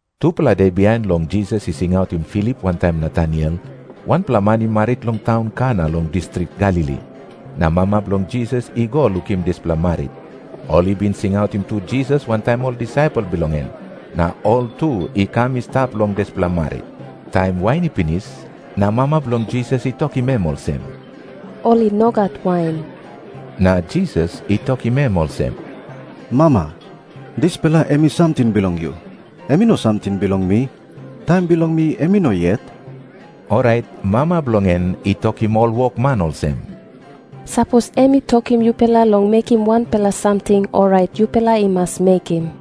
Tupela de bihain long Jisas i singautim Filip wantaim Nataniel, wanpela man i marit long taun Kana long distrik Galili. Na mama bilong Jisas i go lukim dispela marit. Ol i bin singautim tu Jisas wantaim ol disaipel bilong en, na ol tu i kam i stap long dispela marit. Taim wain i pinis, na mama bilong Jisas i tokim em olsem, "Ol i no gat wain." Na Jisas i tokim em olsem, "Mama, dispela em i samting bilong yu. Em i no samting bilong mi. Taim bilong mi em i no yet." Orait mama bilong en i tokim ol wokman olsem, "Sapos em I tokim yupela long mekim wanpela samting, orait yupela i mas mekim."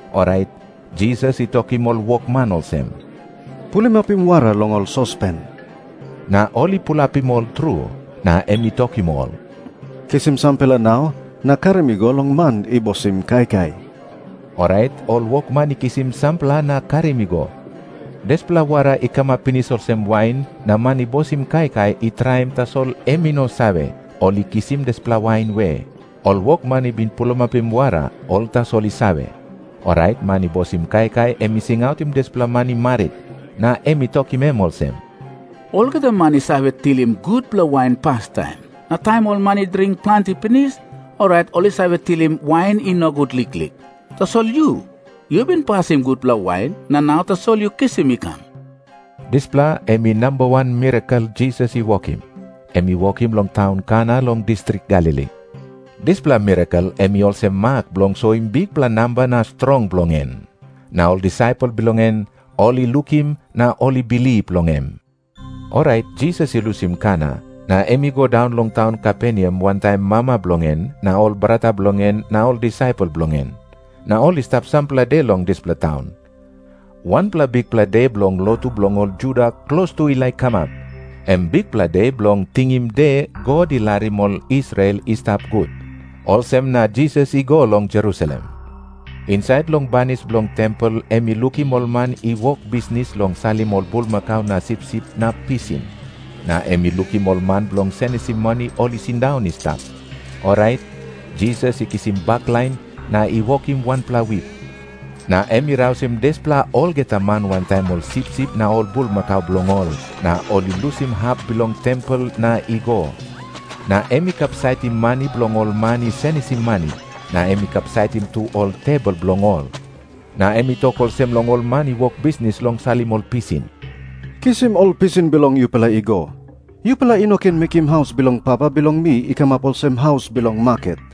Orait Jisas i tokim ol wokman olsem, "Pulimapim wara long ol sospen." Na ol i pulapim ol tru. Na em i tokim ol, "Kisim sampela nau na karim i go long man i bosim kaikai." Orait ol wokman i kisim sampela na karim i go. Dispela wara i kamap pinis olsem wain na man i bosim kaikai i traim, tasol em i no save, ol i kisim dispela wain we. Ol wokman i bin pulimapim wara, ol tasol i save. Orait man i bosim kaikai em i singautim dispela man i marit, na em i tokim em olsem, "Olgeta man i save tilim gutpela wain pastaim. Na taim ol man i dring planti pinis, orait ol i save tilim wain i nogut liklik. Tasol yu, yu bin pasim gutpela wain, na nau tasol yu kisim i kam." Dispela em i namba wan mirakel Jisas i wokim. Em i wokim long taun Kana long distrik Galili. Dispela mirakel em i olsem mak bilong soim bikpela namba na strong bilong en. Na ol disaipel bilong en ol i lukim na ol i bilip long em. Orait Jisas i lusim Kana na em i go daun long taun Kaperneam wantaim mama bilong en na ol brata bilong en na ol disaipel bilong en. Na ol i stap sampela de long dispela taun. Wanpela bikpela de bilong lotu bilong ol Juda klostu i laik kamap, em Bikpela De Bilong Tingim De God I Larim Ol Israel I Stap Gut. Olsem na Jisas i go long Jerusalem. Insait long banis bilong tempel em i lukim ol man i wok bisnis long salim ol bulmakau na sipsip na pisin. Na em i lukim ol man bilong senisim mani ol i sindaun i stap. Orait Jisas i kisim baklain na i wokim wanpela wip. Na em i rausim dispela olgeta man wantaim ol sipsip na ol bulmakau bilong ol, na ol i lusim hap bilong tempel na i go. Na em i kapsaitim mani bilong ol man i senisim mani, na em i kapsaitim tu ol tebol bilong ol. Na em i tok olsem long ol man i wok bisnis long salim ol pisin, "Kisim ol pisin bilong yupela I go. Yupela i no ken mekim haus bilong Papa bilong mi i kamap olsem haus bilong maket."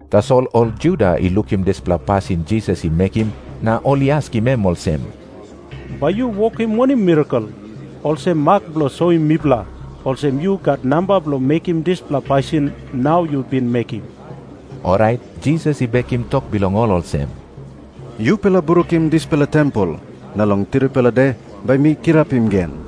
Tasol ol Juda i lukim dispela pasin Jisas i mekim na ol i askim em olsem, "Bai yu wokim wanem mirakel, olsem mak bilong soim mipela olsem yu gat namba bilong mekimdispela pasin nau yu bin mekim?" Orait Jisas i bekim tok bilong ol olsem, "Yupela brukim dispela tempel, na long tripela de bai mi kirapim gen."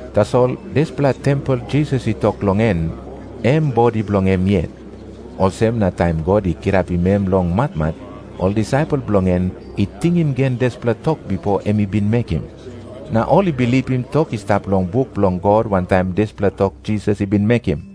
Tasol dispela tempel Jisas i tok long en, em bodi bilong em yet. Olsem na taim God i kirapim em longmatmat, ol disaipel bilong en i tingim gen dispela tok bipo em i binmekim. Na ol i bilipim tok i stap long buk bilong God wantaim dispela tok Jisas i bin mekim.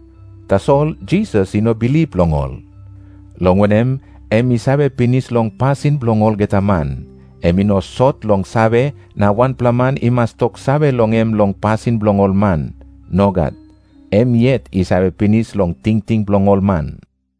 Tasol Jisas i no bilip long ol, long wanem, em i save pinis long pasin bilong olgeta man. Em i no sot long save na wanpela man i mas toksave long em long pasin bilong ol man. Nogat. Em yet i save pinis long tingting bilong ol man.